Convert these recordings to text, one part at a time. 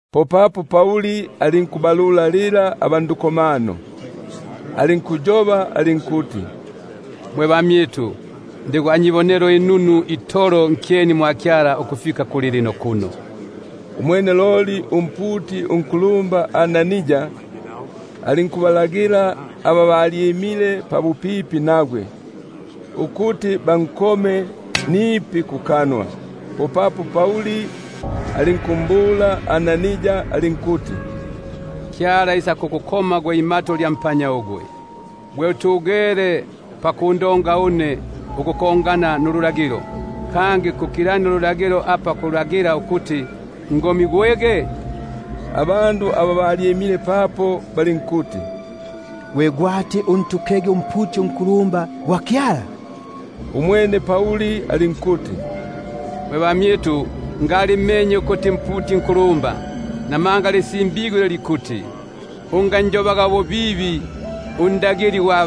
Popapo Pauli alinkubalulalila aba ndukomano, alinkuyoba alinkuti: Mwe bamyitu, ndi gwa nyibonelo inunu itolo nkyeni mwa Kyala ukufika kulilino kuno. Umwene loli umputi unkulumba Anania alinkubalagila aba balyimile pabupipi nagwe, ukuti bankome kukanwa. Popapo Pauli alinkumbula alinkuti: Kyala isakukukoma gwe imato lya mpanya ugwe; gwe utugele pakundonga une ukufwana nululagilo, kangi kukilania ululagilo bo kulagila ukuti ngomi- gwege? Abene aba balyimile papo balinkuti: Gwe gwati untukege umputi unkulumba gwa Kyala? Umwene Pauli alinkuti: Mwe bamyitu, ngalimmenye ukuti mputi nkulumba; buno lisimbigwe ili likuti: Unganjobaga ububibi undagili gwa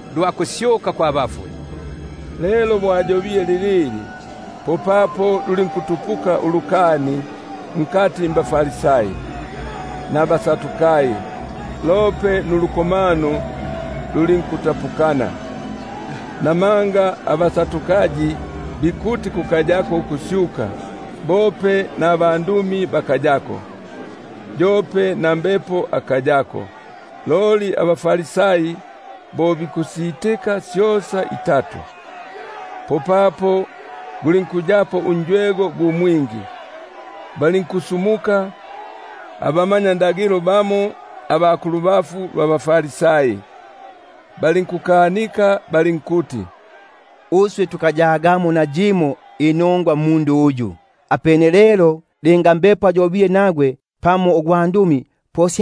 lwa kusyuka kwa bafwe. Lelo bo ayobile lilili, popapo lulinkutupuka ulukani nkati mbaFarisai nabaSadukai, lope nulukomano lulinkutapukana. Namanga abaSadukai bikuti kukayako ukusyuka, bope nabandumi bakayako, yope na Mbepo akayako; loli abaFarisai bo bikusitika syosa. Popapo gulinkuyapo unjwego gu mwingi. Balinkusumuka abamanyakalata bamo aba kulubafu lwa baFarisai, balinkukanika balinkuti: Uswe tukayagamo nayimo inongwa mmundu uyu; apene lelo linga Mbepo ayobile nagwe pamo ugwandumi, po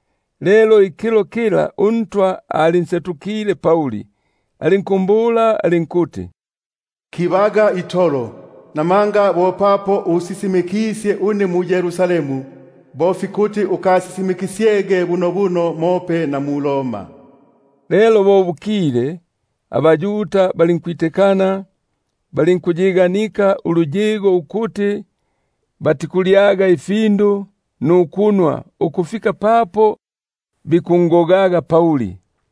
Lelo ikilo kikyo uNtwa alinkunsetukila, alinkumbula alinkuti: Kibaga itolo, buno bo papo usisimikisye une mu-Yerusalemu, bo fikuti ukasisimikisyege bunobuno mope na mu-Roma. Lelo bo bukile, abaYuda balinkwitikana, balinkuyiganika ukuti batikulyaga nukunwa ukufika papo bikungogaga Pauli.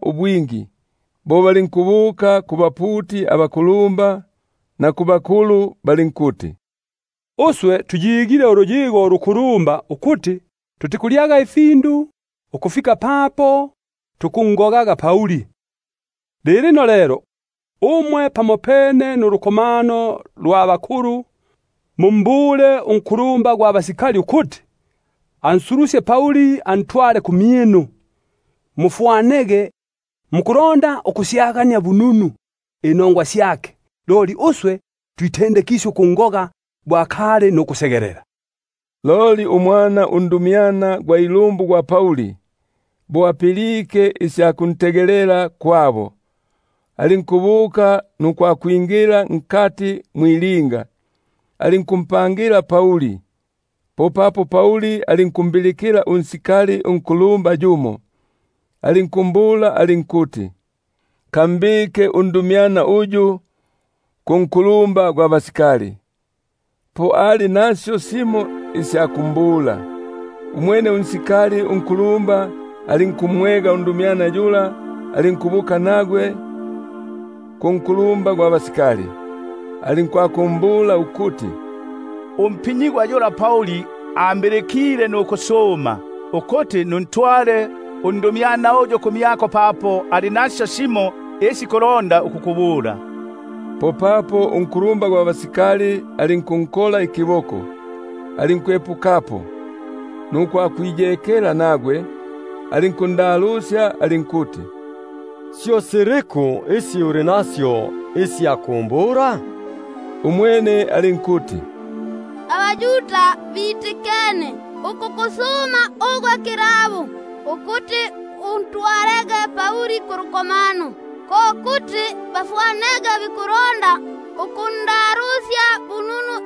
ubwingi. Bo balinkubuka kubaputi abakulumba, na kubakulu balinkuti: Tuyiganike uluyigo ulukulumba, ukuti mukulyaga ifindu ukufika papo tukungogaga Pauli. Lilino lelo, umwe pamopene nulukomano lwa hakulu, mumbule unkulumba gwa basikali, ukuti ansulusye antwale kumyinu, mufwanege mukulonda ukusyagania bununu inongwa syake; loli uswe twitendekisye ukungoga, bo akali nukusegelela. Loli umwana undumyana gwa ilumbu gwa Pauli, bo apilike isya kuntegelela kwabo, alinkubuka nukwakwingila mwilinga, alinkumpangila Pauli. Popapo Pauli alinkumbilikila sarjenti yumo, alinkumbula alinkuti: Kambike undumyana uyu kunkulumba gwa basikali, papo ali nasyo simo isya kumbula. Umwene alinkumwega, alinkubuka nagwe kunkulumba gwa basikali, alinkwakumbula ukuti: Umpinyigwa yula Pauli, ambilikile nukusuma, ukuti nuntwale undumyana uyu ku- myako, papo ali nasyo isi ikulonda ukukubula. Popapo unkulumba gwa basikali alinkunkola ikiboko, alinkwepukapo, nukwakwiyekela nagwe, alinkundalusya alinkuti: Syo siliku isi uli nasyo isya kumbula? Umwene alinkuti: AbaYuda bitikene ukukusuma kilabo, ukuti usulukege na Pauli kulukomano, ko kuti bafwanege bikulonda ukundalusya bununu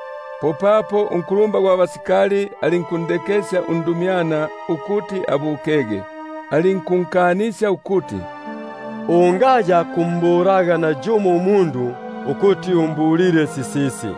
Popapo unkulumba gwa basikali alinkundekesya undumyana ukuti abukege, alinkunkanisya ukuti: Ungayakumbulaga nayumo umundu ukuti umbulile sisisi.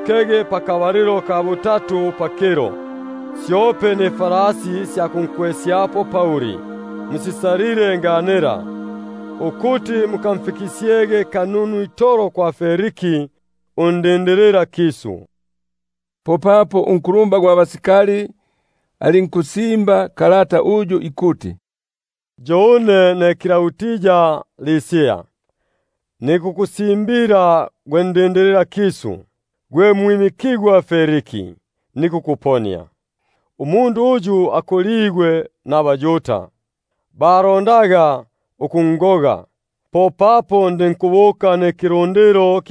kege pakabalilo ka butatu pakilo. Syope nifalasi sya kunkwesyapo Pauli musisalile nganila; ukuti mukamfikisyege bununu itolo kwa Feliki undindililakisu. Popapo alinkusimba kalata uyu ikuti: Klaudi Lisia, kuli gwe ndindililakisu, gwe mwimi- kigwa Feliki, nikukuponia. Umundu uyu akoligwe mbaYuda, balondaga ukungoga; popapo ndinkubuka nikilundilo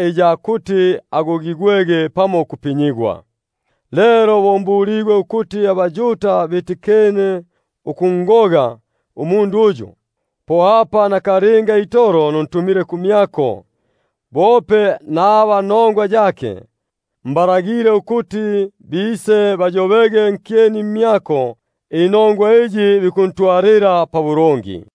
iya kumpelela ukugogigwa pamo ukupinyigwa. Lelo bo mbuligwe ukuti bikulonda ukunsigila umundu uyu, nakalinga itolo nuntumile kumyako, bope naba nongwa yake, mbalagile ukuti bise bayobege nkyeni mmyako inongwa iyi bikundonga.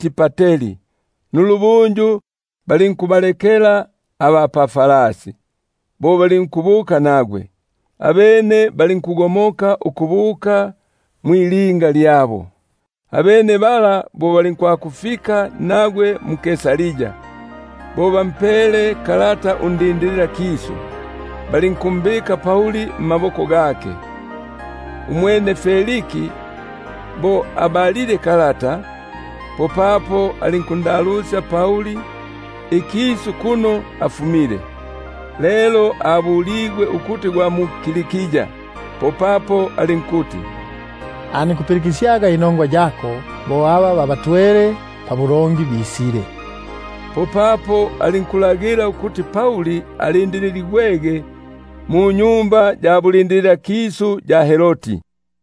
patri. Nulubunju balinkubalekela aba pafalasi ukubuka nagwe; abene balinkugomoka ukubuka mwilinga lyabo. Abene bala bo bafikile mu-Kaisaria, bo bampele kalata undindililakisu, balinkumbika Pauli mmaboko gake. Umwene bo abalile, popapo alinkulalusya ikisu kuno afumile; lelo bo abuligwe ukuti gwa mu-Kilikia, popapo alinkuti: Nikukupilikisyaga bo aba nongwa yako bisile. Popapo alinkulagila ukuti alindililigwege munyumba ya bulindililakisu ya Herodi.